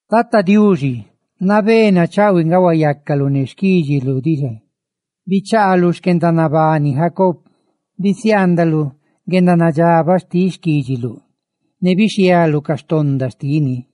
Tata Diuxi, nabé nachaꞌhuiꞌ nga huayacaluꞌ ne xquídxiluꞌ diꞌ xa; bichaaluꞌ xquendanabani Jacob; bisiaandaluꞌ guendanadxabaꞌ xtiꞌ xquídxiluꞌ, ne bixhialuꞌ ca donda xtini;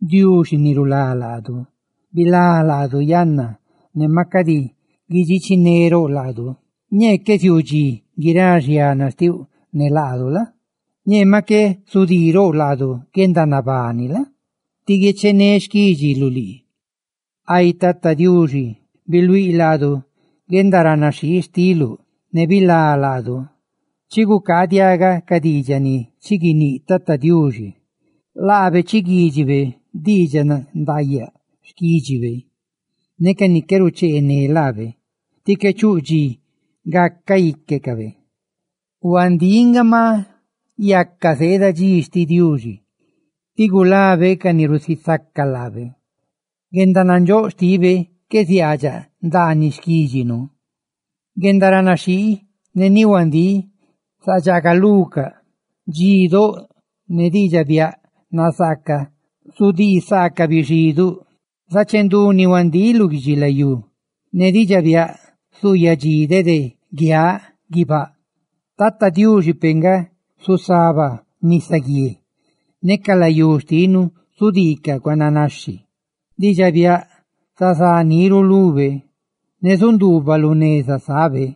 Diuxi ni rulá laadu, ¡bilá laadu yanna, ne maꞌ cadi guidxichinerouꞌ laadu! Ñee qué ziuu dxi guirá xiana xtiuꞌ ne laadu la? Ñee maꞌ qué zudiirouꞌ laadu guendanabani la? tí guiechené xquídxiluꞌ lii. Ay Tata Diuxi, ¡biluíꞌ laadu guendaranaxhii xtiluꞌ, ne bilá laadu! Chigucaaꞌ diaꞌgaꞌ ca diidxaꞌ ni chi guiníꞌ Tata Diuxi; laabe chiguídxibe diidxaꞌ nandaayaꞌ xquídxibe, ca ni qué rucheené laabe, tí qué chuꞌ dxi gacaꞌ íquecabe. Huandíꞌ nga, ma yaca zeeda dxi xtiꞌ Diuxi, ti gulabe ca ni rusisaca laabe; guendanandxóꞌ xtibe qué ziaadxaꞌ ndaaniꞌ xquídxinu. Guendaranaxhii ne ni huandíꞌ zadxaagalucaꞌ, dxidóꞌ ne diidxaꞌ biaꞌ nazaaca zudisaacaꞌ bixiduꞌ, zachendú ni huandíꞌ lu guidxilayú, ne diidxaꞌ biaꞌ zuuyadxí dede guiaꞌ guibáꞌ. Tata Diuxi peꞌ nga zusaba nisaguié, ne ca layú xtinu zudiicaꞌ cuananaxhi. Diidxaꞌ biaꞌ zazá niru lube, ne zaguixhe chaahuiꞌ lu neza sábe.